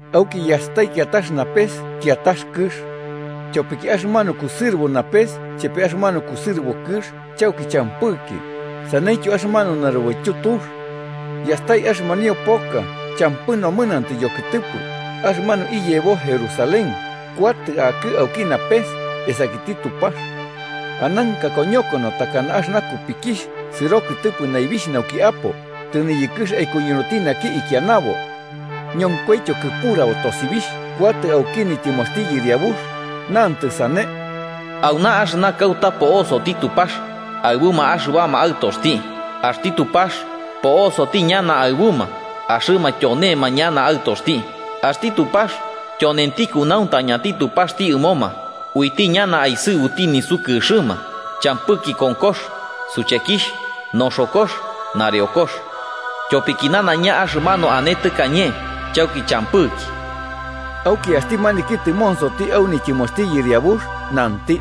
Auki yastai kiatax napes kiatax kɨx. Tyopiki axɨmanu kusɨrɨbo napes chepe axɨmanu kɨsɨrɨbo kɨx chauki champɨki, saneityo axɨmanu narubaityu tux. Yastai axɨmanio poka champɨ nomɨnantɨ yokɨtɨpɨ, axɨmanu iyebo Jerusalén, kuatɨ akɨ auki napes, esakiti Tupax. Ananka koñokono takana axɨna kupikixh sɨro kɨtɨpɨ naibixh nauki apo, tɨniyɨkɨx aikuñunuti naki ikianabo. Ñonkoityo kɨpurabo tosibixh kuatɨ auki nityɨmoxti Yɨriabux, nantɨ sane: “Auna axɨna kauta po'osoti Tupax aɨbuma axɨbama aɨtoxti. Axti Tupax po'osoti ñana aɨbuma, axɨma tyonema ñana aɨtoxti, axti Tupax tyonenti kunauntañati Tupaxti ɨmoma. Uiti ñana aisɨbuti nisukɨxɨma, champɨki konkox, suchekixh, noxokox, nareokox. Tyopiki nanaiña axɨmanu ane tɨkañe chauki champɨki.” Auki axti maniki tɨmonsoti au nityɨmoxti Yɨriabux nanti: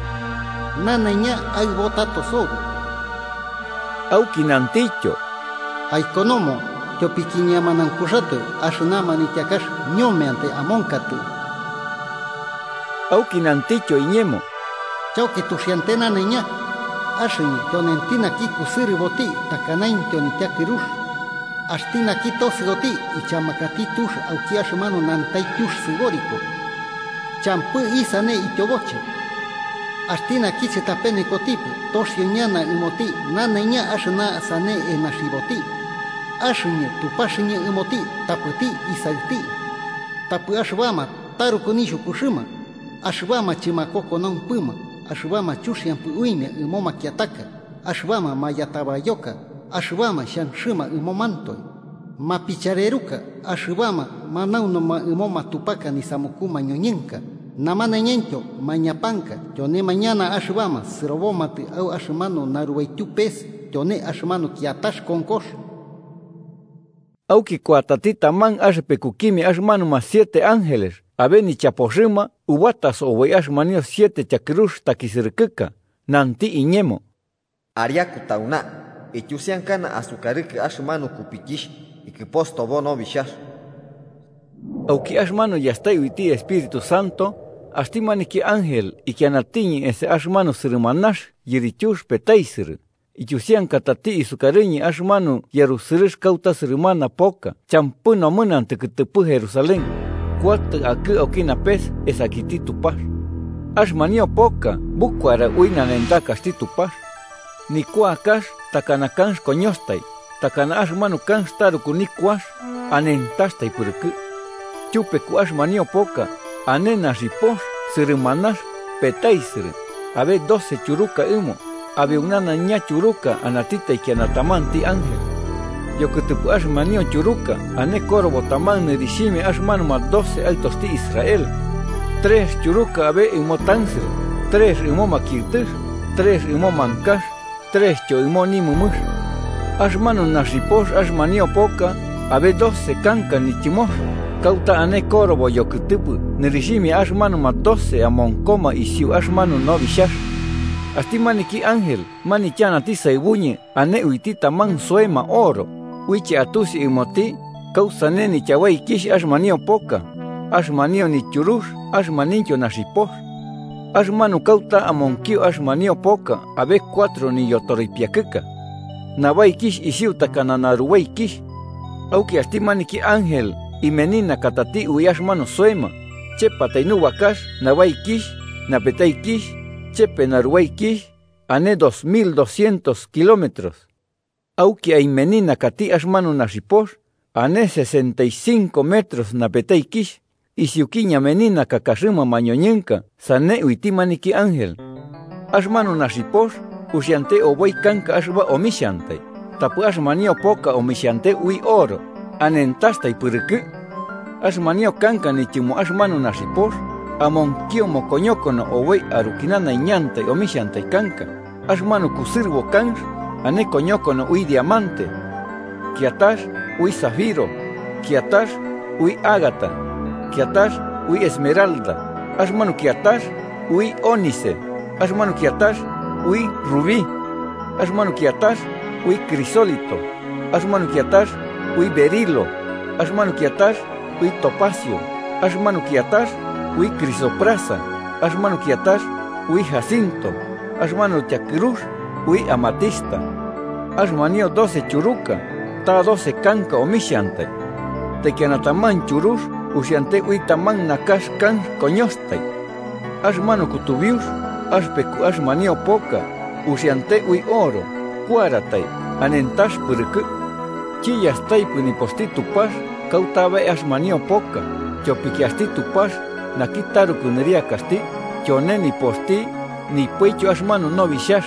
“Nanaiña aɨbo tato sobi.” Auki nantityo: “Aikonomo, tyopiki ñemanaunkuxatoe axɨna manityakax ñomeantai amonkatɨ.” Auki nantityo iñemo: “Chauki tuxiante nanaiña. Axɨñɨ tyonenti naki kusɨrɨboti takanaintyo nityakɨrux. Axti naki tosɨoti, ichamakati tux auki axɨmanu nantaityux sɨboriko, champɨ isane ityoboche. Axti naki chɨtapenekotipɨ toxio ñana ɨmoti nanaiña axɨna sane enaxiboti. Axɨñɨ Tupaxɨñɨ ɨmoti tapɨti isaɨti. Tapɨ axɨbama taruku nixhukuxɨma, axɨbama chɨmakokonaumpɨma, axɨbama chuxiampɨ uimia ɨmo makiataka, axɨbama mayatabayoka, axɨbama xhanxɨma ɨmomantoe, mapichareruka, axɨbama manaunuma ɨmo matupaka nisamuku mañoñɨnka namanaiñaintyo mañapanka, tyonema ñana axɨbama sɨrobomatɨ au axɨmanu narubaityu pes, tyone axɨmanu kiatax konkox.” Auki kuatati taman axɨpekukimia axɨmanuma siete ángeles abe nichapoxɨma ubataso oboi axɨmanio siete tyakɨrux takisɨrɨkɨka, nanti iñemo: “Ariaku tauna, ityusiankana asukarɨkɨ axɨmanu kupikixh ikɨpostobo Nobixhax.” Auki axɨmanu yastai uiti Espíritu Santo, axti maniki ángel ikianatiñɨ esa axɨmanu sɨrɨmanax yirityux petaisɨrɨ, ityusiankatati sukarɨñɨ axɨmanu yarusɨrɨx kauta sɨrɨmana poka champɨ nomɨnantɨ kɨtɨpɨ Jerusalén, kuatɨ akɨ auki napes esakiti Tupax. Axɨmanio poka bukuara ui nanentakaxti Tupax. Nikuakax takana kanx koñoxatai, takana axɨmanu kanx taruku nikuax, anentaxtai pɨrɨkɨ. Tyupeku axɨmanio poka, ane naxipox sɨrɨmanax, petaisɨrɨ, abe doce tyuruka ɨmo, abeu nanaiña tyuruka anati taikiana tamanti ángel. Yokɨtɨpɨ axɨmanio tyuruka ane korobo taman nɨrixhimia axɨmanuma doce aɨtoxti Israel. Trex tyuruka abe ɨmo tansɨrɨ, trex ɨmo makiɨtɨx, trex ɨmo mankax trextyo ɨmo nimɨmɨx. Axɨmanu naxipox axɨmanio poka abe doce kanka nityɨmox, kauta ane korobo yokɨtɨpɨ nɨrixhimia axɨmanuma doce amonkoma isiu axɨmanu Nobixhax. Axti maniki ángel manityanati saɨbuñɨ ane uiti taman soema oro, uiche atusi ɨmoti kausane nityabaikixh axɨmanio poka, axɨmanio nityurux axɨmanuintyo naxipox. Axɨmanu kauta amonkio axɨmanio poka abe cuatro nityoripiakɨka. Nabaikixh isiu takana narubaikixh. Auki axti maniki ángel imeninakatati ui axɨmanu soema: chepatai nubakax nabaikixh, napetaikixh chepe narubaikixh ane dos mil doscientos kilómetros. Auki aimeninakati axɨmanu naxipox: ane sesentaicinco metros napetaikixh, isiuki ñameninakakaxɨma mañoñɨnka sane uiti maniki ángel. Axɨmanu naxipox uxiante oboi kanka axɨba omixhantai, tapɨ axɨmanio poka omixhante ui oro anentaxtai pɨrɨkɨ. Axɨmanio kanka nityɨmo axɨmanu naxipox amonkio mokoñokono oboi aruki nanaiñantai omixhiantai kanka: axɨmanu kusɨrɨbo kanx ane koñokono ui diamante. Kiatax ui zafiro, kiatax ui ágata, kiatax ui esmeralda. Axɨmanu kiatax ui ónice, axɨmanu kiatax ui rubí. Axɨmanu kiatax ui crisólito, axɨmanu kiatax ui berilo. Axɨmanu kiatax ui topacio. Axɨmanu kiatax ui crisoprasa, axɨmanu kiatax ui jacinto axɨmanu tyakɨrux ui amatista. Axɨmanio doce tyuruka, ta doce kanka omixhantai. Taikiana taman tyurux uxiante ui taman nakax kanx koñoxatai. Axɨmanu kutubiux axɨpeku axɨmanio poka uxiante ui oro, kuaratai anentax pɨrɨkɨ. Chiyastaipɨ nipoxti Tupax kauta abe axɨmanio poka, tyopiki axti Tupax naki taruku nɨriakaxti, tyone nipoxti, nipoityo axɨmanu Nobixhax.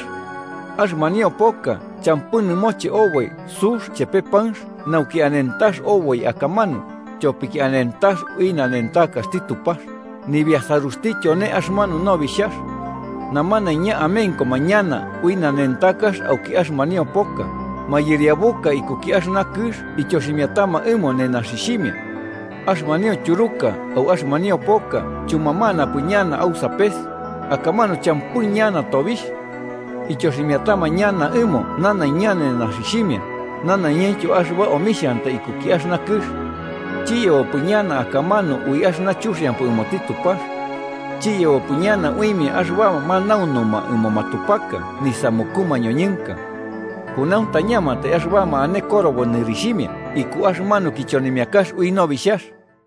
Axɨmanio poka champɨ nɨmoche oboi sux chepe panx nauki anentax oboi akamanu, tyopiki anentax ui nanentakaxti Tupax, nibiasaruxti tyone axɨmanu Nobixhax. Namanaiña amenkoma ñana ui nanentakax auki axɨmanio poka, mayɨriabuka ikuki axɨna kɨx ityoximiatama ɨmo nenaxixhimia. Axɨmanio tyuruka au axɨmanio poka chumamanapɨ ñana au sapes, akamanu champɨ ñana tobixh. Ityoximiatama ñana ɨmo nanaiña nenaxixhimia nanaiñaintyo axɨba omixhiantai ikuki axɨna kɨx. Chiyebopɨ ñana akamanu ui axɨna chuxiampɨ ɨmoti Tupax. Chiyebopɨ ñana uimia axɨbama manaunuma ɨmo matupaka nisamuku mañoñɨnka. Kunauntañamantai axɨbama ane korobo nɨrixhimia iku axɨmanu kichonimiakax ui Nobixhax.